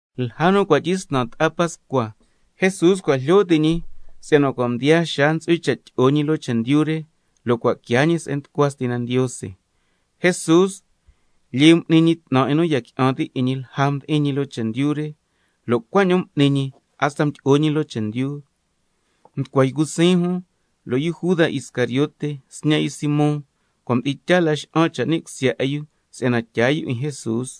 Lja nu cua' tyisnan ta'a pascua, Jesús cua' jlyo ti' ñi si'yana cua' mdiyaa xaa nu ntsu'hui cha' tyi'o ñi loo chendyu re lo' quiaa ñi se'en nducua Stina Ndiose. Jesús lyee m'ni ñi 'tnan 'in nu ya qui'an ti' 'in ñi lja mdi'in ñi loo chendyu re, lo' cuaña'an m'ni ñi hasta mdyi'o ñi loo chendyu. Nducua ycu siin jun, lo' yu Juda Iscariote, sñe' yu Simón, cua' mdi'in tyaa laxa'an cha' ni' cusya 'in yu si'yana tyaa yu 'in Jesús,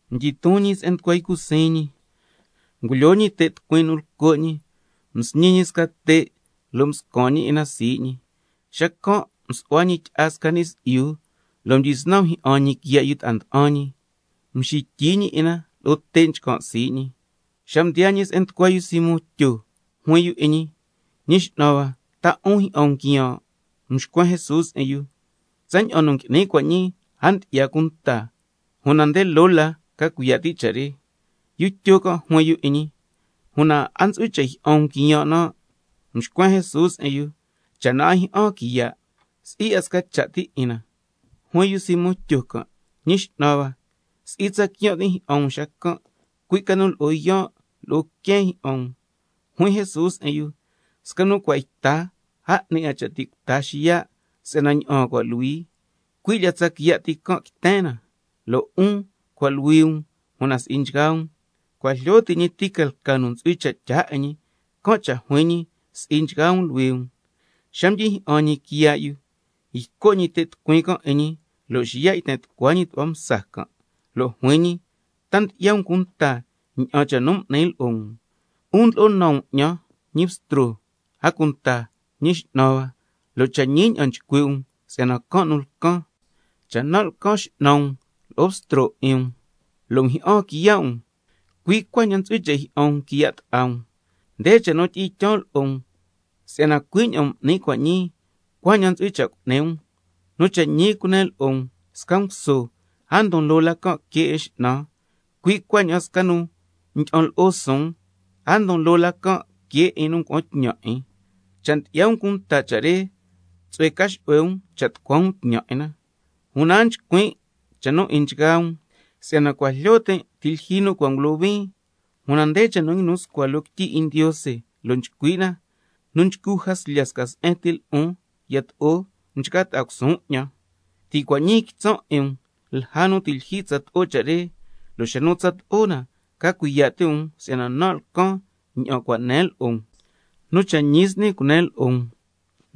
Mdyiton ñi se'en nducua ycu siin ñi, ngulyoo ñi te' tucuin nu lco' ñi, msñi ñi sca te' lo' mscan' ñi 'in na sii' ñi. Xacan' msu'hua ñi tyi'a sca ni' si'yu, lo' mdyisnan mjyi'an ñi quiya' yu ta'a nda'an ñi, mxityi ñi 'in na lo'o te' nchcan' sii' ñi. Xa mdiyaa ñi se'en nducua yu Simón Tyo, juin yu 'in ñi: Ñi X'nan hua, ¿ta 'un jyi'an um quiyan'? Mxcuen Jesús 'in yu: Tsaña'an ngui'nin cua' ñii, a ndyi'ya cunta, una nde loo la ca jlyo ti' cha' re. Yu Tyo can' juin yu 'in ñi: Una a ntsu'hui cha' jyi'an um quiyan' nan'. Mxcuen Jesús 'in yu: Cha' na a jyi'an quiya', si'i 'a sca cha' ti 'in na. Juin yu Simón Tyo can': Ñi X'nan hua, si'i tsa quiyan' tin jyi'an um xacan', cui' ca nu lo'o yaan' lo'o quen jyi'an um. Juin Jesús 'in yu: Sca nu cua' yta, a 'ni 'a cha' ti' cuta xiya' si'yana ña'aan cua' luhui, cui' lya tsa quiya' ti can' quiten na. Lo' 'un cua' luhui um, una si'i nchgaa um. Cua' jlyo ti' ñi ti ca nu ntsu'hui cha' tyaa 'in ñi, can' cha' juin ñi: Si'i nchgaa um luhui um. Xa mdyi jyi'an ñi quiya' jun, yco' ñi te' tucuin can' 'in ñi lo' xiya' yten tucua ñi tu'hua msa can', lo' juin ñi: ¿Ta ndyi'ya um cunta ña'an cha' nu m'nin lo'o um? 'Un ndlo'o naan um 'ñan, Ñi Bstro, a cunta Ñi X'nan hua, lo' cha' ñi ña'an nu nchcui' um si'yana can' nu lcan. Cha' nan' lcan X'nan um lo'o Bstro 'in um, lo' mjyi'an quiya' um, cui' cuaña'an ntsu'hui cha' jyi'an um quiya' scasca ta'a um. Nde cha' nu tyi'in tyaan lo'o um, si'yana cui' ña'an cha' nu m'nin cua' ñii, cuaña'an ntsu'hui cha' cu'ni um. Nu cha' ñi cunen lo'o um, sca nguso a ndon loo la can' que 'in x'nan, cui' cuaña'an lo'o sca nu ndyi'an lo'o suun, a ndon loo la can' que 'in nu ngua'an tñan 'in. Cha' ndyi'ya um cunta cha' re, tsu'hue ca xu'hue um cha' tucua um tñan 'in na. Una a nchcuin' cha' nu 'in nchgaa um, si'yana cua' jlyo tin' ti' lyijyi nu cua' ngulohuin, una nde cha' nu nguinu scua loo quityi 'in Ndiose, lo' nchcui' na: —Nu nchcu jaslya sca se'en ti lo'on, yato'o mchca ta'a cusuun 'ñan—. Ti' cua' ñii quitsan' 'in um lja nu ti' lyijyi tsato'o cha' re, lo' xa nu tsato'o na ca cuiya' ti' um si'yana nan' lcan ña'an cua' nen lo'o um. Nu cha' ñi s'ni cunen lo'o um,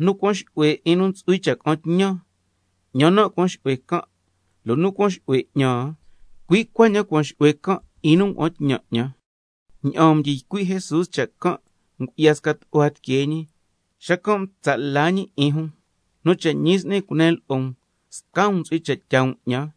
nu cuan xu'hue 'in nu ntsu'hui cha' ca'an tñan, 'ñan nan' cuan xu'hue can', lo' nu cuan xu'hue 'ñan, cui' cuaña'an cuan xu'hue can' 'in nu ngua'an tñan 'ñan. Ña'aan mdyi ycui' Jesús cha' can', ngu'ya sca tu'hua tiquee ñi, xacan' mtsa' la ñi 'in jun: Nu cha' ñi s'ni cunen lo'o um, sca um ntsu'hui cha' tyaa um 'ñan.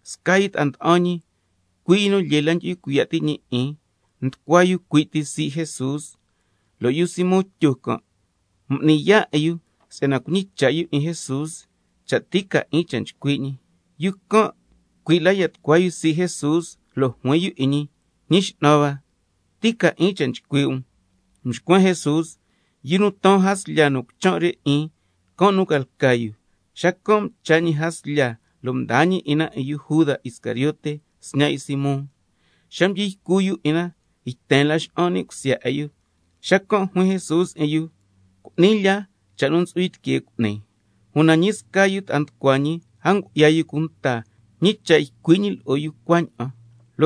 Sca yu ta'a nda'an ñi, cui' yu nu lyee ndyu'hui cuiya' ti' ñi 'in, nducua yu cui' ti sii' Jesús, lo' yu Simón Tyo can' m'ni yaa' 'in yu si'yana cuñicha' yu 'in Jesús cha' ti ca 'in cha' nchcui' ñi. Yu can' cui' la ya tucua yu sii' Jesús, lo' juin yu 'in ñi: Ñi X'nan hua, ti ca 'in cha' nchcui' um? Mxcuen Jesús: Yu nu taan jaslya nu cuchan' re 'in, can' nu lca yu. Xacan' mcha' ñi jaslya lo' mdaa ñi 'in na 'in yu Juda Iscariote, sñe' yu Simón. Xa mdyi ycu yu 'in na, yten Laxa'an ni' cusya 'in yu. Xacan' juin Jesús 'in yu: Cu'ni lya cha' nu ntsu'hui tiquee cu'ni. Una ñi sca yu ta'a nducua ñi a ngu'ya yu cunta ñi cha' ycui' ñi lo'o yu cuaña'an.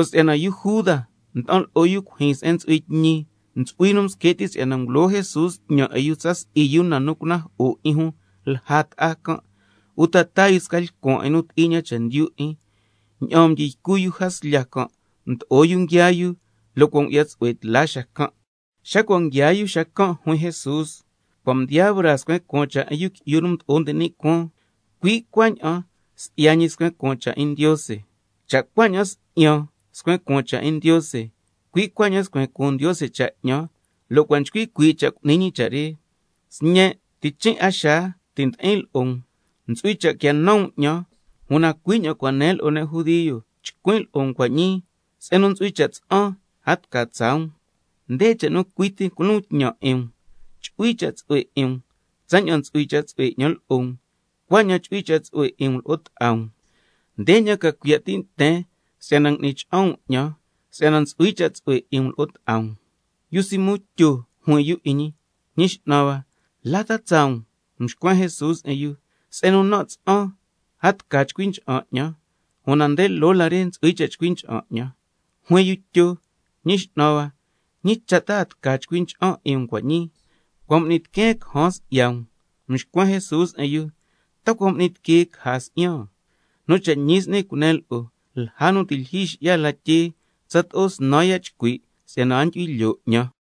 Si'yana yu Juda nda'an lo'o yu cuijyin se'en ntsu'hui tñi, ntsu'hui nu msque' ti' si'yana ngulo Jesús tñan 'in yu tsa si'i yu na nu cunajo'o 'in jun lja ta'a can', uta taa yu sca lcuan 'in nu ti'i ña'an chendyu 'in. Xa mdyi ycu yu jaslya can', cui' xaa mdo'o yu nguiaa yu, lo' cua' ngu'ya tsu'hue tla xacan'. Xa cua' nguiaa yu, xacan' juin Jesús: Cua' mdiyaa braa scuen cuaan cha' 'ñan, Yu Qui'yu nu Mdo'o nde ni' Cuaan, cui' cuaña'an Ndiose scuen cuaan cha' 'ñan. Cha' cuaña'an si'yan scuen cuaan cha' 'in Ndiose, cui' cuaña'an scuen cuaan Ndiose cha' 'ñan, lo' cua' nchcui cuii' cha' cu'ni ñi cha' re. Sñen', ti' chin' 'a xaa ti' ndi'in lo'o um. Ntsu'hui cha' quia nan um 'ñan, una cui' ña'an cua' nen lo'o ne' judio, chcuin' lo'o um cua' ñii: Se'en nu ntsu'hui cha' tsa'an, 'un a tca tsaa um. Nde cha' nu cui ti culon tñan 'in um, scasca um chu'hui cha' tsu'hue 'in um. Tsaña'an ntsu'hui cha' tsu'hue 'ñan lo'o um, cuaña'an chu'hui cha' tsu'hue 'in um scasca um. Ndeña'an ca cuiya' ti' nten si'yana ngui'ni cha'an um 'ñan, si'yana ntsu'hui cha' tsu'hue 'in um scasca um lo'o ta'a um. Yu Simón Tyo juin yu 'in ñi: Ñi X'nan hua, ¿la ta tsaa um? Mxcuen Jesús 'in yu: Se'en nu nan' tsa'an, a tca chcui ncha'an 'ñan, una nde loo la re ntsu'hui cha' chcui ncha'an 'ñan. Xacan' juin yu Tyo: Ñi X'nan hua, ¿ñi cha' a tca chcui ncha'an 'in um cua' ñii? Cua' m'nin tiqueen cajan si'ya um. Mxcuen Jesús 'in yu: ¿Ta cua' m'ni tiquee caja si'yan? Nu cha' ñi s'ni cunen lo'o, lja nu ti' lyijyi xi'ya latyee, tsato'o snan ya' chcui' si'yana a ndyu'hui lyoo 'ñan.